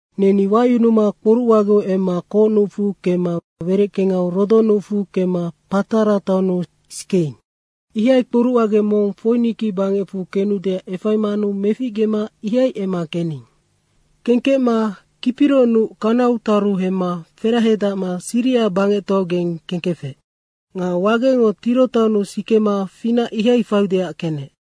Neni wayunuma kporucwageu emma Ko nucfu kemma wereckengau Rodo nucfu kemma Patara taonnu sikeing. Ihai kporucwage mong Foiniki bangecfu kenudeac efaimanu meficgema ihai emma kening. Kengkecma Kipiro nuc kanaugeng taru hemma ferahadacma Siria bangectoaugeng kengkefec. Nga wagengo Tiro taonnu sikema finac ihai faiudeac kenec.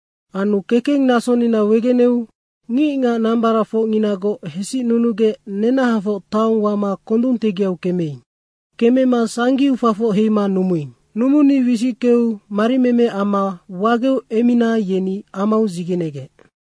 Anu kekeng nasonina wegeneu ngicngac nambaracfocnginagoc hesicnunugec nenahafoc taong wama kondung tegiau kemeing. Kemema sangiu fafoc heima numuing. Numuni wisickeu marimeme amma wageu emmina yeni amau dzigenegec.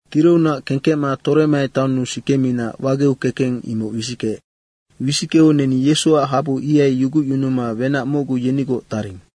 Tirounac kengkecma Toremai taonnu sikemina wageu kekeng imoc wisickeec. Wisickeu neni Yesuac habu ihai yugucyunuma wenac mocgu yenigoc taring.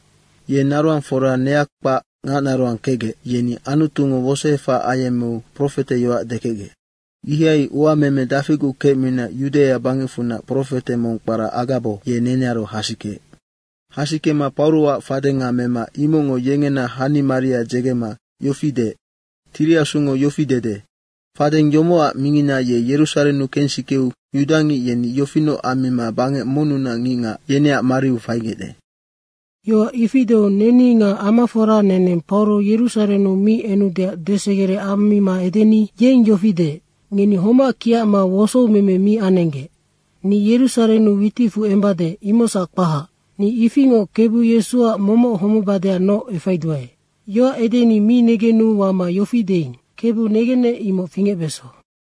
Ye naroangfora neakpac ngacnaroang kecgec, yeni Anutungo wosoefac ayemmeu profeteyoac dekecgec. Ihai uameme dafiguc kecmina Yudaia bangecfunac profete mong kpara Agabo, ye nenearu hasikeec. Hasikema Pauroac fadenga mema imocngo yengena hanimaria dzegema yofi deec, “Tiri Asungo yofi dede, ‘Fadeng yomocac mingina ye Yerusarennu kensikeu yudangic yeni yofinoc ammima bangec monnunac ngicngac, yeneac mariu faigecde.’” Yoac ifi deu neni nga amafora neneng Pauro Yerusarennu mi enudeac desegere ammima edeni yeng yofi deec, “Ngeni homac kiacma wosoumeme mi anenggec. Ni Yerusarennu witicfu embade, imocsac kpahac. Ni ifingoc Kebu Yesuac momoc homebadeacnoc efaiduae.” Yoac edeni mi negenu wama yofi deing, “Kebu negenec, imoc fingecbeso.”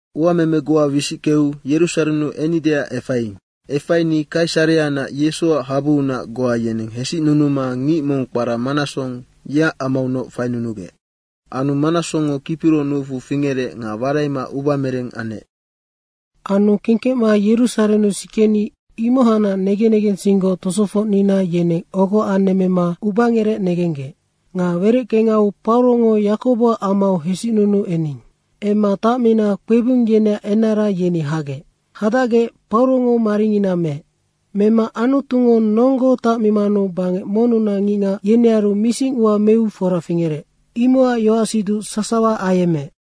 Uameme goa wisickeu Yerusarennu ennideac efaiing. Efaini Kaisareanac Yesuac habuunac goa yeneng hesicnunuma ngic mong kpara Manasong, yeac amaunoc fainunugec. Anu Manasongngo Kipiro nucfu fingerec nga waraima ubamereng anec. Anu kengkecma Yerusarennu sikeni imohacnac negen negensinggoc tosofocnina yeneng ogo anemmema ubangerec negenggec. Nga wereckengau Paurongo Yakoboac amau hesicnunuu ening. Emma tacmina kpebung yeneac enara yeni hagec. Hadacgec Paurongo maringina meec. Mema Anutungo nonggo tacmimanu bangec monnunac ngicngac, yenearu misingua meu fora fingerec, imocac yoacsiduc sasawa ayemmeec.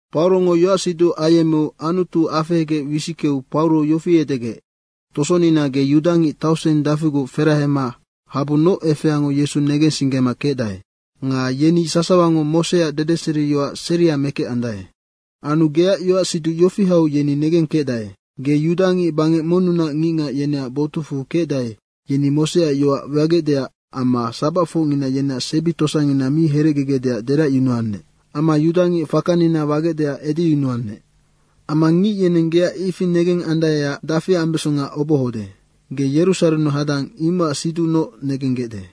Paurongo yoacsiduc ayemmeu Anutu afehegec wisickeu Pauro yofi edegec, “Tosonina, ge yudangic tauseng dafiguc ferahema habunoc efeango Yesu negensinggema kecdae. Nga yeni sasawango Moseac dedeseriyoac seria mekecandae. Anu geac yoacsiduc yofi hau yeni negengkecdae: Ge yudangic bangec monnu ngicngac, yeneac botucfu kecdae, yeni Moseac yoac wagecdeac amma sabacfocngina yeneac sebi tosangina mi herecgegecdeac deracyunuannec. Amma yudangic fakanina wagecdeac edeyunuannec. Amma ngic yeneng geac ifi negengandaeac dafi ambesonga obohode. Ge Yerusarennu hadang, imocac siducnoc negenggecde.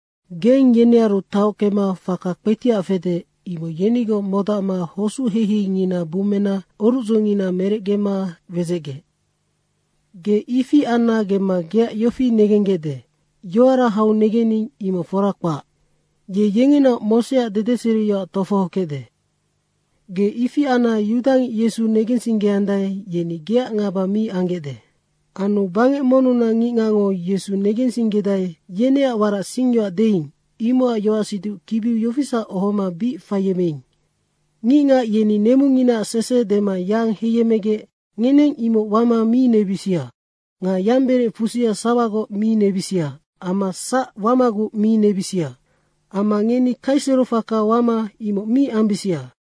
Geng yenearu tahockema faka kpetiac fede, imoc yenigoc modacma hosuc heiheingina bummena orucdzongina merecgema wedzecgec. Ge ifi anna gemma geac yofi negenggecde, ‘Yoara hau negening, imoc fora kpac. Ye yengenaoc Moseac dedeseriyoac tofohokecde.’ Ge ifi anna yudangic Yesu negensinggedae, yeni geac ngaba mi anggecde. Anu bangec monnunac ngicngacngo Yesu negensinggedae, yeneac warac singyoac deing, imocac yoacsiduc kibiu yofisac ohoma bic faiyemmeing, ngicngac yeni nemunginaac sese dema yang heiyemmegec ngeneng imoc wama mi nebisia. Ngeni yamberec fusia sawagoc mi nebisia amma sac wamaguc mi nebisia. Amma ngeni kaisero faka wama imoc mi ambisia.”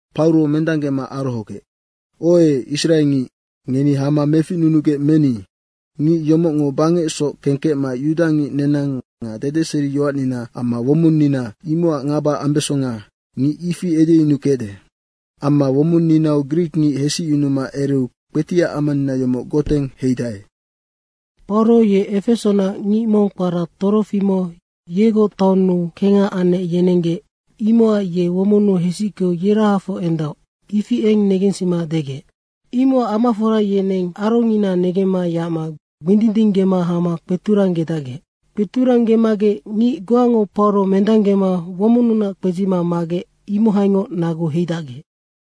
Pauro mendanggema arohogec, “Oe Israengic, ngeni hama meficnunugec meni! Ngic yomocngo bangecsoc kengkecma yudangic nenang nga dedeseriyoacnina amma womonnina, imocac ngaba ambesonga, ngic ifi edeyunukecde. Amma womonninau grikngic hesicyunuma ereu kpetiac amanina yomoc goteng heidae.” Pauro ye Efesonac ngic mong kpara Trofimo yegoc taonnu kengha anec yerenggec, imocac ye womonnu hesickeu yerahafoc endaoc, ifi eng negensima degec. Imocac amafora yeneng arongina negemma yacma gbindindinggema hama kpeturanggedacgec. Kpeturanggemagec ngic goango Pauro mendanggema womonnunac kpedzima magec, imohaingoc nagu heidacgec.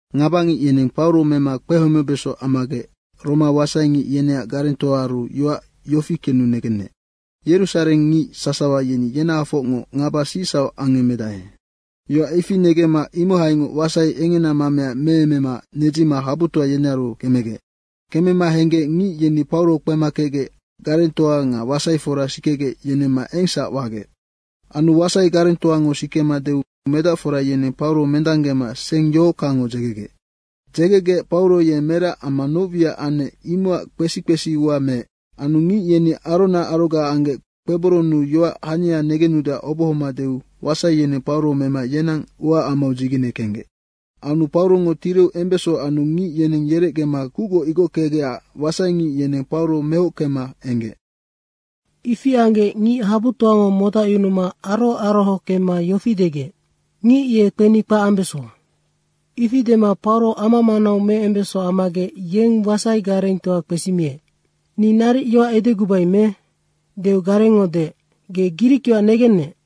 Ngabangic yeneng Pauro mema kpehomebeso ammagec Roma wasaingic yeneac garengtoaaru yoac yofi kenu negenec, “Yerusarengngic sasawa yeni yenahafocngoc ngaba sicsauc angemedae.” Yoac ifi negemma imohaingoc wasai engena mamea meemema nedzima habutoa yenearu kemegec. Kemema henggec ngic yeni Pauro kpema kecgec garengtoa nga wasaifora sikegec, yenemma engsac wagec. Anu wasai garengtoango sikema deu medacfora yeneng Pauro mendanggema seng yohockangngo dzegegec. Dzegegec Pauro ye merac amma noc wiac anec, imocac kpesi kpesi ua meec. Anu ngic yeni arona aroga anggec kpeboronnu yoac hania negenudeac obohoma deu wasai yeneng Pauro mema yenang uaamau dzigene kenggec. Anu Paurongo tireu embeso anu ngic yeneng yerecgema kucgoc igockegecac wasaingic yeneng Pauro mohockema enggec. Ifi anggec ngic habutoango modacyunuma aroho aroho kemma yofi degec, “Ngic ye kpeni kpac ambeso!” Ifi dema Pauro ama manau meembeso ammagec, yeng wasai garengtoa kpesimiec, “Ni naric yoac edegubai me?” deu garengngo deec, “Ge grikyoac negennec?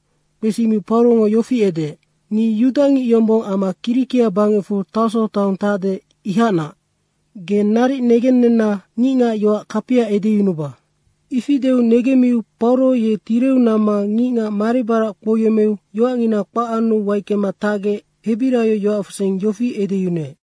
Kpesimiu Paurongo yofi edeec, “Ni yudangic yombong amma Kirikia bangecfu Tarso taong tacde, imohacnac. Ge naric negennenna ngicngac yoac kapia edeyunuba.” Ifi deu negemmiu Pauro ye tireu namma ngicngac maribarac kpouyemmeu yoacngina kpac anu waickema tacgec hebiraio yoacfusing yofi edeyunuec.